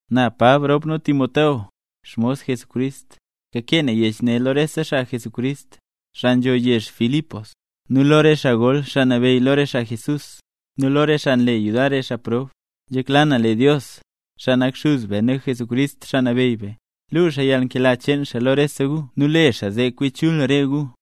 Na Pab rop Timoteo, xmos Jesucrist, kakee na yech ne lo rese xaa mle nambey Jesús, xaa nzho yezh Filipos; nu lo re xaa gol xaa nabeyy lo re xaa Jesús; nu lo re xaa nle yudar re xaa prob. Nzhekla na lee Dios, xaa nak Xuz be nu xuz Jesucrist, Xaa Nabeyy be, luu xaa yalnkela cheen xaa lo rese gu nu le xaa zee kwi chul re gu.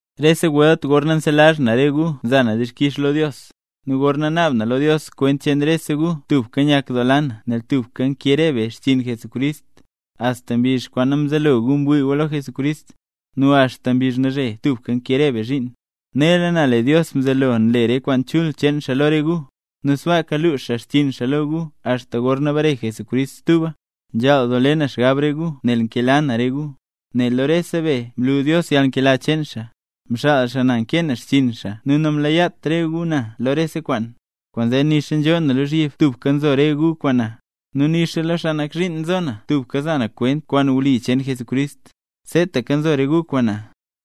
Rese welt gorna nselazh na re gu nza na dixkix lo Dios. Nu gorna naab na lo Dios kwent cheen rese gu tubka nyakdoola na nel tubka nkee re be xchiin Jesucrist, axta mbizh kwaan mzelo gu ngwii gu lo Jesucrist, nu axta mbizh nalzhe tubka nkee re be zhiin. Nela na lee Dios mzelo nle re kwaan chul cheen xaa lo re gu, nu sbaaka lux xaa xchiin xaa lo gu axta gorna bare Jesucrist stuba. Nzhaal doo le na xgab re gu nel nkela na re gu, nel lo rese be mlu Dios yalnkela cheen xaa. Mxaal xaa na nkee na xchiin xaa nu namlaat re gu na lo rese kwaan. Kwaanzee nixa nzhoo na lozhyib tubka nzo re gu kwaan na, nu nixa lo xaa nak zhiin nzo na, tubka nza na kwent kwaan wli cheen Jesucrist, seetaka nzo re gu kwaan na.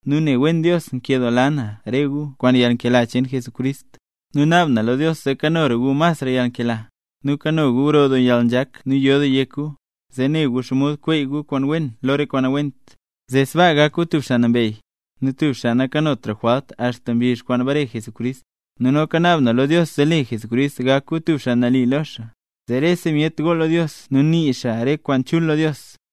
Nu ne wen Dios nkedoola na re gu kwaan yalnkela cheen Jesucrist. Nu naab na lo Dios zee kanora gu masra yalnkela, nu kano gu grodoo yalnzhak nu yo doo yek gu. Zee ne gu xomod kweey gu kwaan wen lo re kwaan nawent, zee sbaa gak gu tub xaa nambey, nu tub xaa nakanotra jwalt axta mbizh kwaan bare Jesucrist. Nu noka naab na lo Dios zee le Jesucrist gak gu tub xaa nali lo xaa, zee rese myet gool lo Dios nu nii xaa re kwaan chul lo Dios.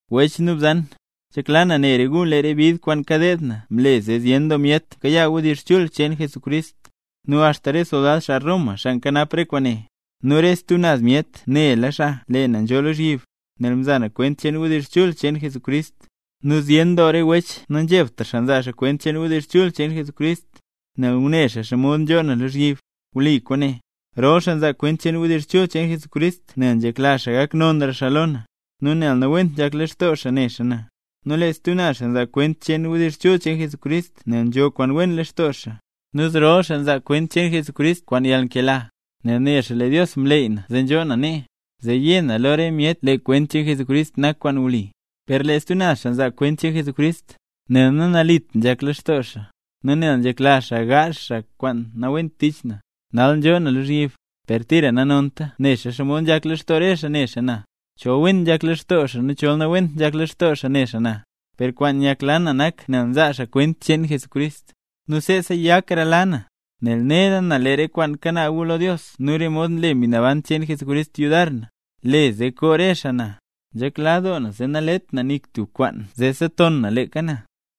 Wech nu bzan, nzhekla na ne re gu lee re bid kwaan kadeed na mle zee zyen doo myet mkayaa wdizh chul cheen Jesucrist. Nu axta re soldad, xaa Roma, xaa nkanap re kwaan nee, nu re stub naz myet nela xaa lee na nzhoo lozhyib nel mzaa na kwent cheen wdizh chul cheen Jesucrist. Nu zyen doo re wech nanzhebtra nzaa kwent cheen wdizh chul cheen Jesucrist, nel ngune xaa xomod nzhoo na lozhyib. Wli kwaane: Rol xaa nzaa kwent cheen wdizh chul cheen Jesucrist nel nzhekla xaa gak nonra xaa lo na, nu nel nawent nzhak lextoo xaa ne xaa na, nu lee stub naz xaa nzaa kwent cheen wdizh chul cheen Jesucrist nel nzho kwaan wen lextoo xaa. Nu zrol xaa nzaa kwent cheen Jesucrist kwaan yalnkela, nel ne xaa lee Dios mleey na zee nzhoo na nee, zee yé na lo re myet lee kwent cheen Jesucrist nak kwaan wli. Per lee stub naz xaa nzaa kwent cheen Jesucrist, nel nanalit nzhak lextoo xaa, nu nel nzhekla xaa gaazh xaa re kwaan nawent tich na, nal nzhoo na lozhyib. Per tira nanonta, nexa xomod nzhak lextoo re xaa ne xaa na, chol wen nzhak lextoo xaa nu chol nawent nzhak lextoo xaa ne xaa na, per kwaan nyakla na nak nel nzaa xaa kwent cheen Jesucrist. Nu seesa yaklara na, nel nela na lee re kwaan kanaab gu lo Dios nu re mod nle Mbi Naban cheen Jesucrist yudar na, le zee koo re xaa na. Nzhekla doo na zee nalet na nik tub kwaan zee seton na leeka na.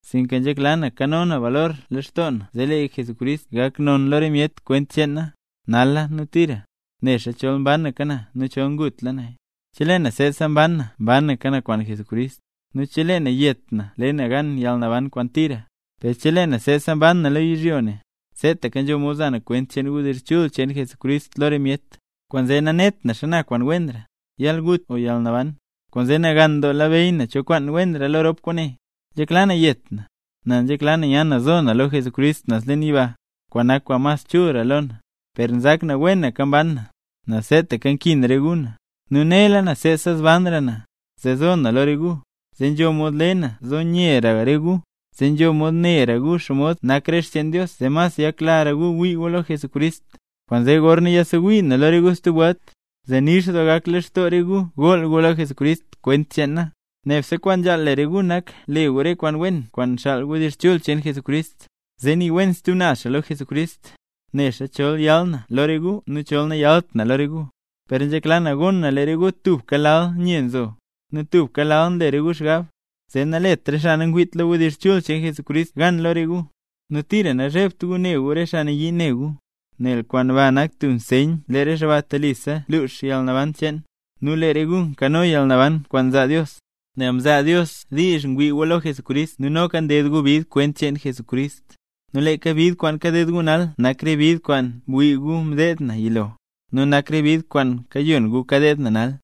Sinka nzhekla na kano na balor leen lextoo na zee lee Jesucrist gak non lo re myet kwent cheen na, nala nu tira; nexa chol mbanaka na nu chol ngutla naya. Chelee na seesaka mban na mbanaka na kwaan Jesucrist, nu chelee na yet na le na gan yalnaban kwaan tira. Per chelee na seesaka mban na lo yizhyo ne, seetaka nzho mod za na kwent wdizh chul cheen Jesucrist lo re myet; kwaanzee nanet na xana kwaan wenra, yalgut o yalnaban. Kwaanzee nagan doo labeyy na cho kwaan wenra lo rop kwaane. Nzhekla na yet na, nel nzhekla na nya na zo na lo Jesucrist naz leen yiba, kwaan nak kwaan mas chulra lo na. Per nzak na wenaka mban na, nel seetaka nkin re gu na. Nu nela na seesa zbanra na, zee zo na lo re gu, zee nzho mod le na zee zo nyera re gu, zee nzho mod nera gu xomod nak re xcheen Dios zee mas yaklara gu wii gu lo Jesucrist. Kwaanzee gorna yasewii na lo re gu stub welt, zee nix doo gak lextoo re gu gool gu lo Jesucrist kwent cheen na. Nebse kwaan nzhaal le re gu nak le gu re kwaan wen kwaan nxaal wdizh chul cheen Jesucrist, zee nii wen stub naz xaa lo Jesucrist. Nexa chol yal na lo re gu nu chol nayalt na lo re gu, per nzhekla na gon na lee re gu tubka lal nye nzo, nu tubka lal nle re gu xgab, zee nalet re xaa nangwiit lo wdizh chul cheen Jesucrist gan lo re gu. Nu tira nazhebt gu ne gu re xaa nayii ne gu, nel kwaan ba nak tub nseyn lee re xaa ba telisa lux yalnaban cheen, nu lee re gu kano yalnaban kwaan nzaa Dios. Nel mzaa Dios diizh ngwii gu lo Jesucrist nu noka ded gu bid kwent cheen Jesucrist. Nu leeka bid kwaan kaded gu nal nak re bid kwaan mwii gu mdeed na yilo, nu nak re bid kwaan kayon gu kadeed na nal.